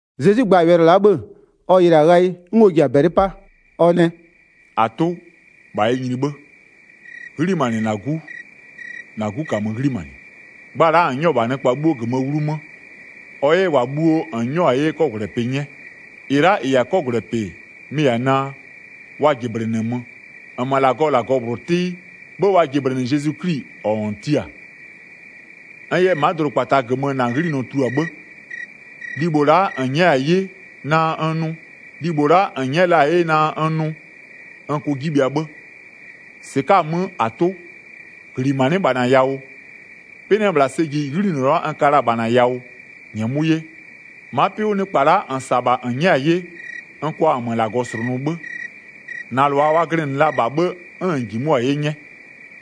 Zezwi gba-a wɛlɩ la'a 'bhë-ë, ɔ yɩlɩ-a ghayɩ 'n ɔ ji-a -bɛlɩ 'pa, ɔ nɛ: “-Atʋ, -bha yɛ nyini 'bhë, 'ghlimanɩ -na 'Gu -na 'Gu -kamö 'ghlimanɩ. Gba la'a -n 'nyɔ-ɔ -bha nɩkpa 'bhuo -gömöö 'wlumö, ɔ 'yɛ -wa bhuo -n 'nyɔ-a 'ye 'kɔgwlɛpɩ 'nyɛ. 3-Ɩ la'a -ɩ -yɛ-a 'kɔgwlɛpɩ-ɛ, mɩ-ɩ -yɛ-a naa, wa -jɩblɩnɩmö, -nmö -Lagɔɔ -Lagɔ -bhlʋ 'tɩ, 'bhë wa jɩblɩnɩ Zezwi 'Kli -ɔ -n tia-a. N yɛ ma'a dʋdʋkpata -gömö -na 'ghlinɔ tulua 'bhë, libho la'a -n nyɛ'ɛ la-a 'ye naa n nʋʋ, n kʋ 'ji bhɩa 'bhë. 5-Sɩka'a-a 'mö, -Atʋ, -ghlimanɩ'ɩ -bha -na yawʋ, 'pɩ 'nɩ-ɛ -bhla sɛ ji 'ghlinɔ la'a n ka la-a -bha -na yawʋ, -nyɛmʋ'ʋ 'ye. Ma'a 'pɩ 'wʋ nɩkpa la'a -n -sa-a -bha -n nyɛ'ɛ-a 'ye, n kʋa -nmö -Lagɔ -slʋnʋ 'bhë. -Na -lʋa wa glɩnɩ la -bha 'bhë 'n -n -jimʋ'ʋ-a 'ye 'nyɛ,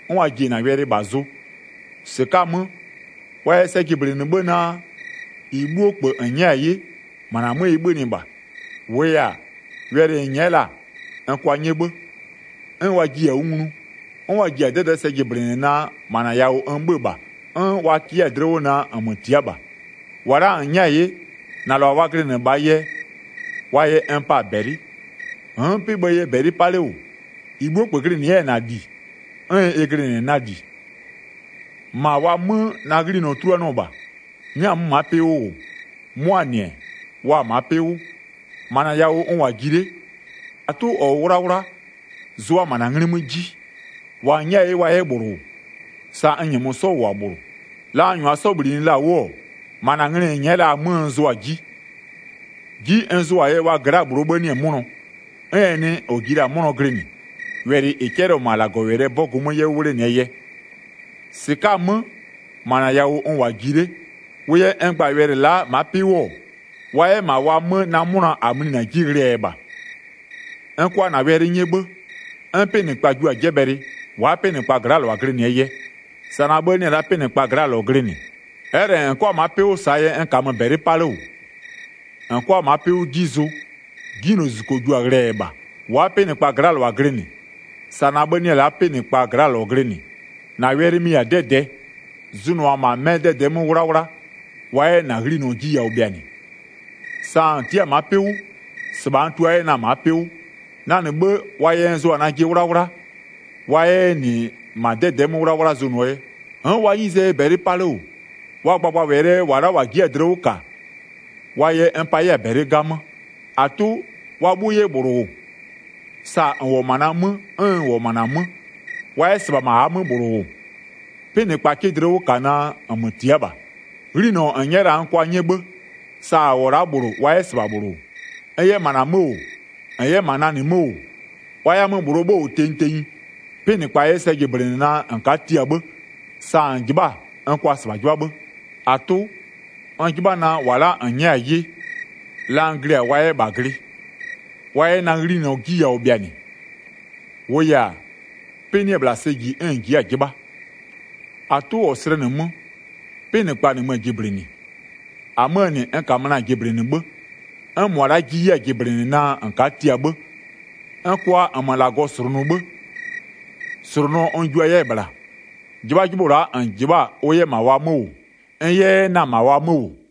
'n wa ji-e -na wɛlɩ -bha zʋ. 7-Sɩka'a-a 'mö, wa yɛ sɛ jɩblɩnɩ 'bhë naa, -ɩ 'bhuo -kpö -n nyɛ'ɛ-a 'ye, -ma -na 'mö ɩ 'bhönɩ -bha. 8-Wʋʋ yɛ-a, wɛlɩ -n nyɛ'ɛ la-a, n kʋa 'nyɛ 'bhë, 'n wa jiɩ-a 'wʋ nglu, 'n wa ji-a 'dɛdɛ'ɛ sɛ jɩblɩnɩ naa -ma -na yawʋ n 'bhö-ö -bha, 'n wa kɩ 'yɛ-a dlɩ 'wʋ naa -nmö tia'a -bha. 9-Wa la'a -n nyɛ'ɛ-a 'ye, -na -lʋa wa glɩnɩ -bhaa yɛ, wa yɛ n pa-a -bɛlɩ, n'n 'pɩ-ɩ bhëë yɛ -bɛlɩ 'pa 'le -wʋ. 10-Ɩ 'bhuo -kpö glɩnɩ-ɛ na -li, -na -li ɩ glɩnɩ -bha, -ɩ 'bhuo -kpö glɩnɩ 'yɛ-ɛ -na -li 'n ɩ glɩnɩ-ɛ na -li. -Ma wa 'mö na 'ghlinɔ 'tuluanɩɔ -bha. 11N'n-a 'mö ma'a 'pɩ 'wʋ -wʋ, 'mʋaa -nɩ-ɛ, wa-a ma'a 'pɩ 'wʋ. -Ma -na yawʋ n -wʋ-a ji 'le. -Atʋ -ɔ -wʋ 'wlawla, zʋʋa -ma -na 'nglɩ 'mö 'ji, -wa -n nyɛ'ɛ-a 'ye wa 'yɛ -bhlʋ -wʋ, sa n -nyɛmö 'sɔ -wʋ-a -bhlʋ. 12La n -nyʋa 'sɔ -bhlinɩ la-a 'wʋ-ɔ, -ma -na nglɩ -n nyɛ'ɛ la-aa 'mö n zʋʋ-a 'ji. 'Ji n zʋʋa-aa yɛ, wa gla'aa -bhlʋɔ 'bhë 'nɩ-ɛ 'mʋnɔ, 'n ɛ nɩ -ɔ ji la-a 'mʋnɔ glɩnɩ, wɛlɩ -ɩ 'cɛlɩɔ-ɔ -ma -Lagɔwɛlɩɛ 'bɔgʋ 'mö 'yɛ 'wʋ 'wlenɩɛ yɛ. 13-Sɩka'a-a 'mö, -ma -na yawʋ n -wʋ-a ji 'le. -Wʋʋ yɛ n gba-a wɛlɩ la'a ma'a 'pɩ 'wʋ-ɔ, wa 'yɛ -ma wa 'mö na 'mʋna -a mlinɩ-a 'ji ghlɩɛ yɛ -bha. 14N kʋa -na wɛlɩ 'nyɛ 'bhë, 'n 'pɩnɩkpa jua-a 'jɛbhɛlɩ, wa'a 'pɩnɩkpaa gla'aa -lʋa glɩnɩɛ yɛ, sa na 'bhë 'nɩ-ɛ la'a 'pɩnɩkpaa gla'aa -lɔ glɩnɩ. 15Ɛ'ɛ -lɛ -n 'kʋa ma'a 'pɩ 'wʋ -saa yɛ n -kamö -bɛlɩ 'pa 'le -wʋ, -n 'kʋa ma'a 'pɩ 'wʋ 'ji zʋ, 'Jinylozuzuko jua-a ghlɩɛ yɛ -bha. 16Wa'a 'pɩnɩkpaa gla'aa -lʋa glɩnɩ, sa na 'bhë 'nɩ-ɛ la'a 'pɩnɩkpaa gla'aa -lɔ glɩnɩ. 17-Na wɛlɩ, mɩ-ɩ -yɛ-a 'dɛdɛɛ, zʋnʋʋa -ma 'mɩ 'dɛdɛ'ɛ 'mö 'wlawla, wa 'yɛ -na 'ghlinɔ 'ji yawʋ bhɩanɩ. 18Sa -n tia'a-a ma'a 'pɩ 'wʋ, -sɩbha n tua 'yɛ na-a ma'a 'pɩ 'wʋ. 19Na -nɩ 'bhë, wa yɛ n zʋa-a najɩ 'wlawla wa 'yɛ 'yɛ -nɩ -ma 'dɛdɛ'ɛ 'mö 'wlawla zʋnʋɔ yɛ. 20N'n wa 'nyizee yɛ -bɛlɩ 'pa 'le -wʋ, wa gbagbawɛlɩɛ yɛ -wa la'a -wa ji'i-a dlɩ 'wʋ -kaa, wa yɛ n pa 'yɛ-a -bɛlɩ 'gamö. 21-Atʋ, wa 'bhuo 'yɛ -bhlʋ -wʋ, sa -n -wʋ-ɔ -ma na 'mö 'n n -wʋ-ɔ -ma -na 'mö, wa 'yɛ -sɩbha -ma -aa 'mö -bhlʋ -wʋ, 'pɩnɩkpa 'kɩ dlɩ 'wʋ -ka naa -nmö tia'a -bha. 22'Ghlinɔ -n nyɛ'ɛ la-a n kʋa 'nyɛ 'bhë, sa -a -wʋ-ɔ la'a -bhlʋ wa 'yɛ -sɩbha -bhlʋ -wʋ. 23N 'yɛ -ma wa 'mö -wʋ, -n 'yɛ -ma na -nɩ 'mö -wʋ, wa 'yɛ-a 'mö -bhlʋɔ 'bhë -wʋ tenyi tenyi, 'pɩnɩkpa 'yɛ sɛ jɩblɩnɩ naa -n ka'a tia 'bhë, sa -n -jɩbha'a-a -n kʋa -sɩbha 'jɩbha 'bhë. 24-Atʋ, n 'jɩbha naa, -wa la'a -n nyɛ'ɛ-a ye, la n glɩ-a wa 'yɛ -bha glɩ, wa 'yɛ -na 'ghlinɔ 'ji yawʋ bhɩanɩ. -Wʋʋ yɛ-a, 'pɩ 'nɩ-ɛ -bhla sɛ ji 'n -n ji'i-a 'jɩbha. 25-Atʋ -ɔ slɛnɩ 'mö, 'pɩnɩkpa -nɩmö-ö jɩblɩnɩ, -amöö -nɩ, n -kamö na-a jɩblɩnɩ 'bhë, 'n -mʋa la'a jiɩ 'yɛ-a jɩblɩnɩ naa -n ka'a tia 'bhë. 26N kʋa -nmö -Lagɔ -slʋnʋ 'bhë, -slʋnʋɔ n jua 'yɛ-ɛ -bhla, 'jɩbhajɩbhʋ la'a -n -jɩbha'a-a ʋ 'yɛ -ma wa 'mö -wʋ, n 'yɛ 'yɛ na-a -ma wa 'mö -wʋ.”